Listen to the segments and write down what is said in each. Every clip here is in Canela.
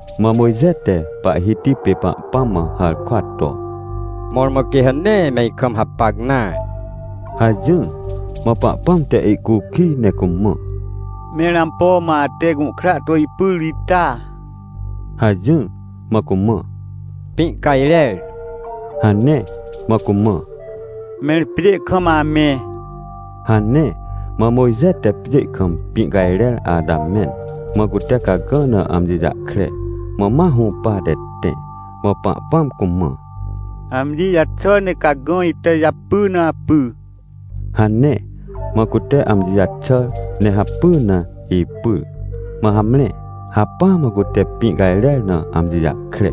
Mã Mojxe te Pahhiti pê Pahpãm mã harkwa to: — Mõrmõ quê ha nee me ikam hapacnare — hajỹr. Mã Pahpãm te ihcukij ne cumã: — Mẽr ampo mã ate gũhkra to ipyr ita? — hajỹr. Mã cumã: — Pĩ cajrer — hane. Mã cumã: — Mẽr pjê kam amẽ — hane. Mã Mojxe te pjê kam pĩ cajrer ata mẽn, mã cute cagã na amji jahkre, mã ma hũpate tẽ. Mã Pahpãm cumã: — Amji jaxà ne cagã ita japy na apy — hane. Mã cute amji jaxàr ne hapy na ipyr, mã hamre, hacpỹa mã cute pĩ cajrer na amji jahkre.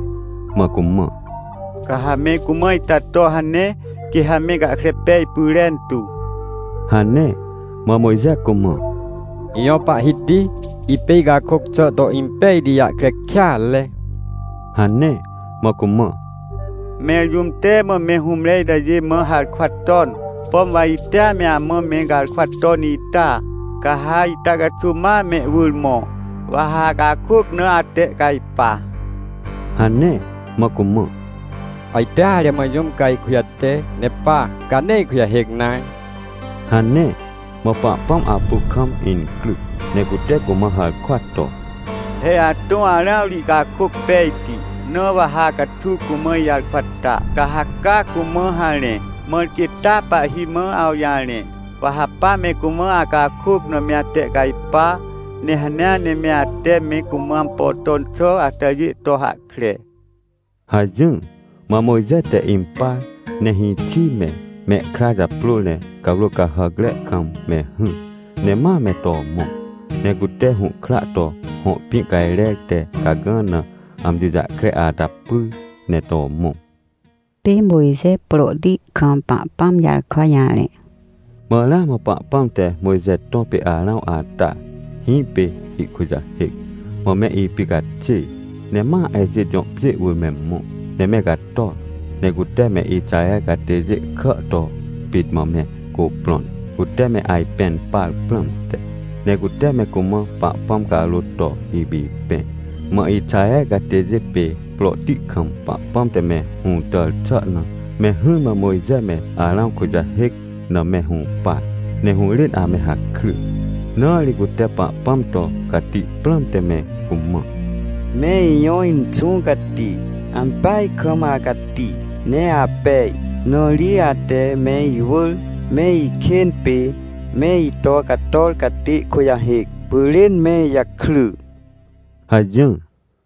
Mã cumã: — Ca ha me cumã itato hane, quê ha me gahkre pej pyrentu — hane. Mã Mojxe cumã: — Ijõ Pahhiti, ipê icakôc xà to impejti jahkre kêatre — hane. Mã cumã: — Mẽr jũm te mã mehũmre itajê mã harkwa ton? Pom wa itea me amã me garkwaton ita? Ca ha itacaxuw ma mehwỳr mõ, wa ha acakôc na atehcajpa — hane. Mã cumã: — Ajteare mã jũm ca ihkujate, ne pa, ca nee ikujahêc nare — hane. Mã Pahpãm apu kam incryc ne cute cumã harkwa to: — He atõ Arãw ri ihcakôc pejti, na wa ha acaxuw cumã ijarkwa ta, ca ha cacumã harẽ, mãr quê taa pahhi mã awjarẽ. Wa ha pa me cumã acakôc na me atehcajpa, nehanea ne me ate me cumã ampo ton xà atajê to hahkre — hajỹr. Mã Mojxe te impar ne hĩxi me, mehkra japrôr ne cawrô cahàcre kam me hỹr, ne ma me to mõ. Ne cute hũhkra to hõ pĩ cajrer tecagã na amji jahkre ata pyr ne to mõ. Pê Mojxe prohti kam Pahpãm jarkwa jarẽ Mã ramã Pahpãm te Mojxe tõ pê Arãw ata, hĩpê ihkujahêc, mã me ipicaxêr. Ne ma Ejit jõ pjê wỳr me mõ, ne me cator. Ne cute me Ixaher catêjêkà to pit mã mecuprõn, cute me ajpẽn par prãmte. Ne cute me cumã Pahpãm carôt to ipipẽ. Mã Ixaher catêjê pêprohti kam Pahpãm te me hũtàr xà na, me hỹrmã Mojxe me Arãw kujahêc name hũpar, ne hũrên ame hakry. Na ri cute Pahpãm to cati prãmte me cumã: — Me ijõ Inxũ Cati! Ampeaj kam acati ne apej! Na ri ate me iwỳr me ikên pê me ito cator catê kujahêc pyrên me ijakry — hajỹr.